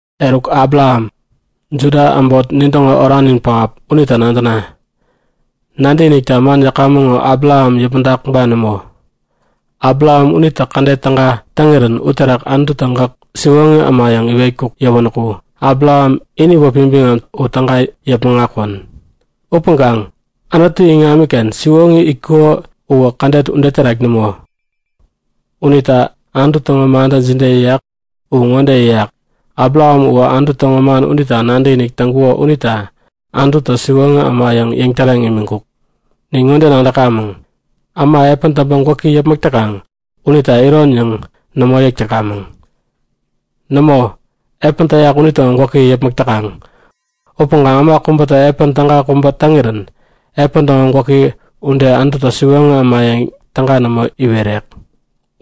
Eruk Abraham, Juda äbot nintäŋo oranin pähap unita nadäna. Nadäkinikta man yäkamäŋ ŋo Abraham yäpmäŋtak ba nämo? Abraham unitä kädet täga täŋirän uterak Anututä gäk siwoŋi äma yäŋ iwetkuk yäwänäku Abraham ini wäpi biŋam u täga yäpmäŋ akwän. Upäŋkaŋ Anutu iŋamiken siwoŋi itkuko uwä kädet ude terak nämo. Unita Anutu täŋo mantä jide yäyak? U ŋode yäyak; Abraham uwä Anutu täŋo man unita nadäkinik täŋkuko unita Anututä siwoŋi äma yäŋ yäŋtäreŋ imiŋkuk. Nin ŋode nadäkamäŋ; Äma epän täŋpäŋ gwäki yäpmäk täkaŋ unita iron yäŋ nämo yäk täkamäŋ. Nämo, epän täyak unitäŋo gwäki yäpmäk täkaŋ. Upäŋkaŋ äma kubätä epän täga kubä täŋirän epän täŋo gwäki ude Anututä siwoŋi äma yäŋ täga nämo iwerek.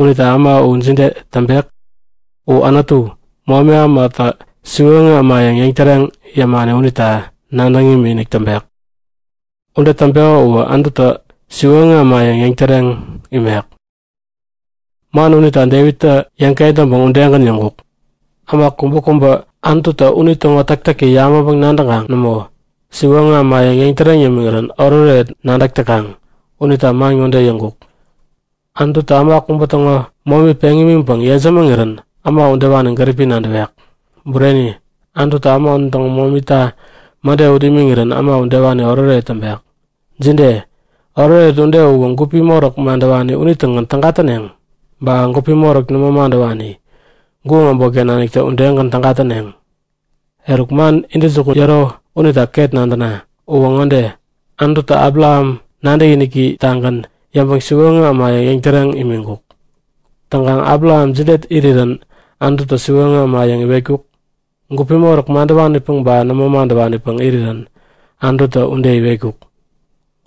Unita äma u jide täŋpek? U Anutu, momi ämata siwoŋi äma yäŋ yäŋtäreŋ yämani unita nadäŋ imikinik täŋpek. Ude täŋpeko uwä Anututä siwoŋi äma yäŋ yäŋtäreŋ imek. Man unita Devittä yäŋ-kentäŋpäŋ udegän yäŋkuk. Äma kubäkubä Anututä unitäŋo täktäki yabäŋpäŋ-nadäŋkaŋ nämo, siwoŋi äma yäŋ yäŋtäreŋ yämiŋirän oretoret nadäk täkaŋ unita man ŋode yäŋkuk; Anututä äma kubä täŋo momi peŋ imiŋpäŋ yejämäŋirän äma udewani gäripi nadäwek. Bureni, Anututä äma unitäŋo momita mäde ut imiŋirän äma udewani oretoret täŋpek. Jide, oretoret ude uwä gupi moräk madäwani unitägän täga täneŋ? Ba gupi moräk nämo madäwani, guŋ äbotken naniktä udegän täga täneŋ? Eruk man intäjukun yäro unita ket nadäna. Uwä ŋode; Anututä Abraham nadäkiniki-tagän yäŋpäŋ siwoŋi äma yäŋ yäŋtäreŋ imiŋkuk. Täŋkaŋ Abraham jide irirän Anututä siwoŋi äma yäŋ iwetkuk? Gupi moräk madäwanipäŋ ba nämo madäwanipäŋ irirän Anututä ude iwetkuk?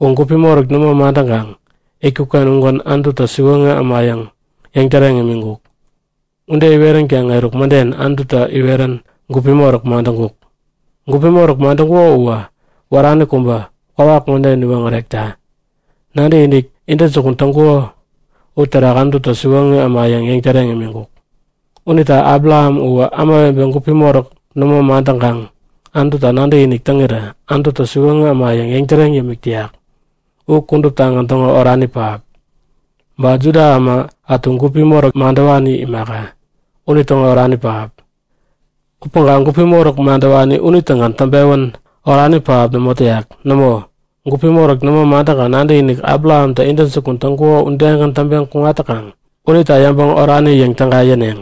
U gupi moräk nämo madäŋkaŋ itkuk-ken ugän Anututä siwoŋi äma yäŋ yäŋtäreŋ imiŋkuk. Ude iweränkaŋ eruk mäden Anututä iwerän gupi moräk madäŋkuk. Gupi moräk madäŋkuko uwä wärani kubä, kwawak ŋode iwoŋärekta; Nadäkinik intäjukun täŋkuko uterak Anututä siwoŋi äma yäŋ yäŋtäreŋ imiŋkuk. Unita Abraham uwä ämawebe gupi moräk nämo madäŋkaŋ Anututa nadäkinik täŋirä Anututä siwoŋi äma yäŋ yäŋtäreŋ yämik täyak u kuduptagän täŋo orani pähap. Ba Juda äma ätu gupi moräk madäwani imaka, unitäŋo orani pähap. Upäŋkaŋ gupi moräk madäwani unitägän täŋpewän orani pähap nämo täyak. Nämo, gupi moräk nämo madäŋkaŋ nadäkinik Abrahamtä intäjukun täŋkuko udegän täŋpeŋ kuŋat täkaŋ unita yäŋpäŋ orani yäŋ täga yäneŋ.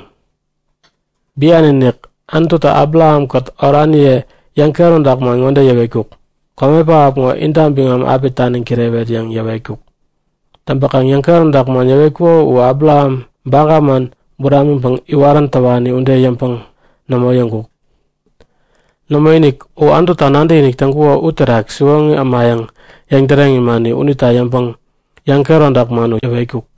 Bian-inik Anututä Abrahamkät oraniye yäŋkehäromtak man ŋode yäwetkuk; Kome pähap ŋo inta biŋam api taniŋ kirewet yäŋ yäwetkuk. Täŋpäkaŋ yäŋkehäromtak man yäwetkuko u Abraham baga man buramiŋpäŋ iwarän täwani ude yäŋpäŋ nämo yäŋkuk. Nämoinik, u Anututa nadäkinik täŋkukuo u terak siwoŋi äma yäŋ yäŋtäreŋ imani unita yäŋpäŋ yäŋkehäromtak man u yäwetkuk.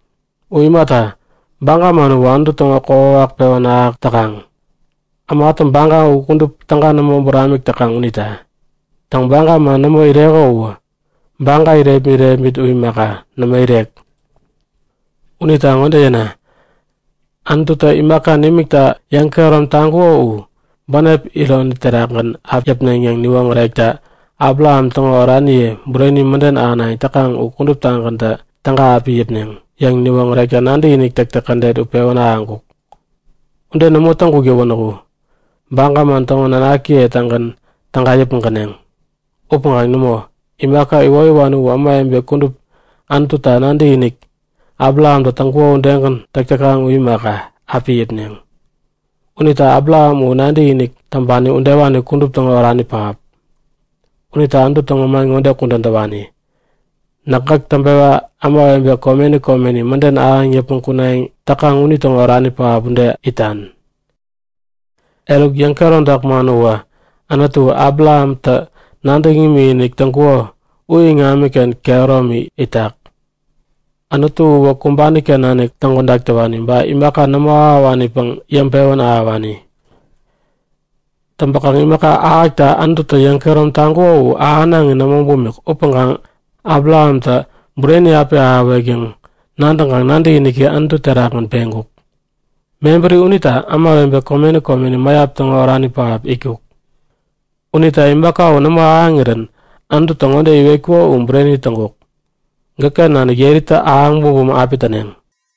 U imata, baga man uwä Anutu täŋo kokwawak pewän ahäk täkaŋ, ämatä baga u kudup täga nämo buramik täkaŋ unita. Täŋ, baga man nämo ireko uwä baga irepmit-irepmit u imaka, nämo irek. Unita ŋode yäna; Anututä imaka nimikta yäŋkehärom taŋkuko u, bänep iron terakgän api yäpneŋ yäŋ niwoŋärekta, ba Abraham täŋo oraniye bureni mäden ahänayäŋ täkaŋ u kuduptagäntä täga api yäpneŋ yäŋ niwoŋärekta nadäkinik täktäk kädet u pewän ahäŋkuk. Ude nämo täŋkuk yäwänäku, baga man täŋo nanakiye-tägän täga yäpmäŋkäneŋ. Upäŋkaŋ nämo, imaka iwoyäwani u ämawebe kudup Anututa nadäkinik Abrahamtä täŋkuko udegän täk täkaŋ u imaka, api yäpneŋ. Unita Abraham u nadäkinik täŋpani udewani kudup täŋo orani pähap. Unita Anutu täŋo man ŋode kudän täwani; Näk gäk täŋpewa ämawebe komeni komeni mäden ahäŋ yäpmäŋ kunayäŋ täkaŋ unitäŋo orani pähap ude itan. Eruk, yäŋkehäromtak man uwä Anutu Abrahamtä nadäŋ imikinik täŋkuko u iŋamiken kehäromi itak. Anutu uwä kumbani-ken nanik täŋkodak täwani, ba imaka nämo ahäwanipäŋ yäŋpewän ahäwani. Täŋpäkaŋ imaka ahäkta Anututä yäŋkehärom taŋkuko u ahänaŋi nämo bumik upäŋkaŋ Abrahamtä bureni api ahäwek yäŋ nadäŋkaŋ nadäkiniki Anutu terakgän peŋkuk. Mebäri unita ämawebe komeni komeni mäyap täŋo orani pähap itkuk. Unita imaka u nämo ahäŋirän Anututä ŋode iwetkuko u bureni täŋkuk; Gäkken nanik yeritä ahäŋ bumbum api täneŋ.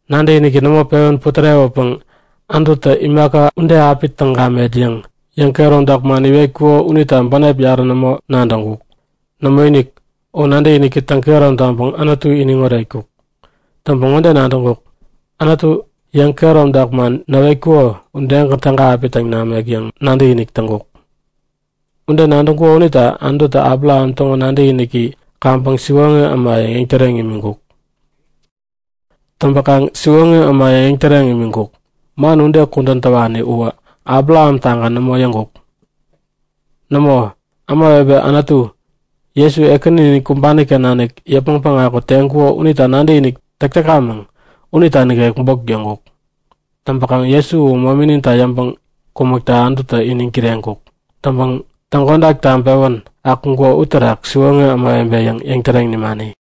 Nadäkiniki nämo pewän putärewäpäŋ Anututä imaka ude api täŋ gamet yäŋ yäŋkehäromtak man iwetkuko unita bänep yarä nämo nadäŋkuk. Nämoinik, u nadäkiniki täŋkehärom taŋpäŋ Anutu iniŋ oretkuk. Täŋpäŋ ŋode nadäŋkuk; Anutu yäŋkehäromtak man näwetkuko udegän täga api täŋ namek yäŋ nadäkinik täŋkuk. Ude nadäŋkuko unita Anututä Abraham täŋo nadäkiniki kaŋpäŋ siwoŋi äma yäŋ yäŋtäreŋ imiŋkuk. Täŋpäkaŋ “siwoŋi äma yäŋ yäŋtäreŋ imiŋkuk”, man ude kudän täwani uwä Abraham-tagän nämo yäŋkuk. Nämo, ämawebe Anutu, Jesu Ekäninin kumbani-ken nanik yäpmäŋ päŋaku teŋkuko unita nadäkinik täk täkamäŋ unita nikek bok yäŋkuk. Täŋpäkaŋ Jesu u momininta yäŋpäŋ kumäkta Anututä iniŋ kireŋkuk. Täŋpäŋ täŋkodak täŋpewän akuŋkuko uterak siwoŋi ämawebe yäŋ yäŋtäreŋ nimani.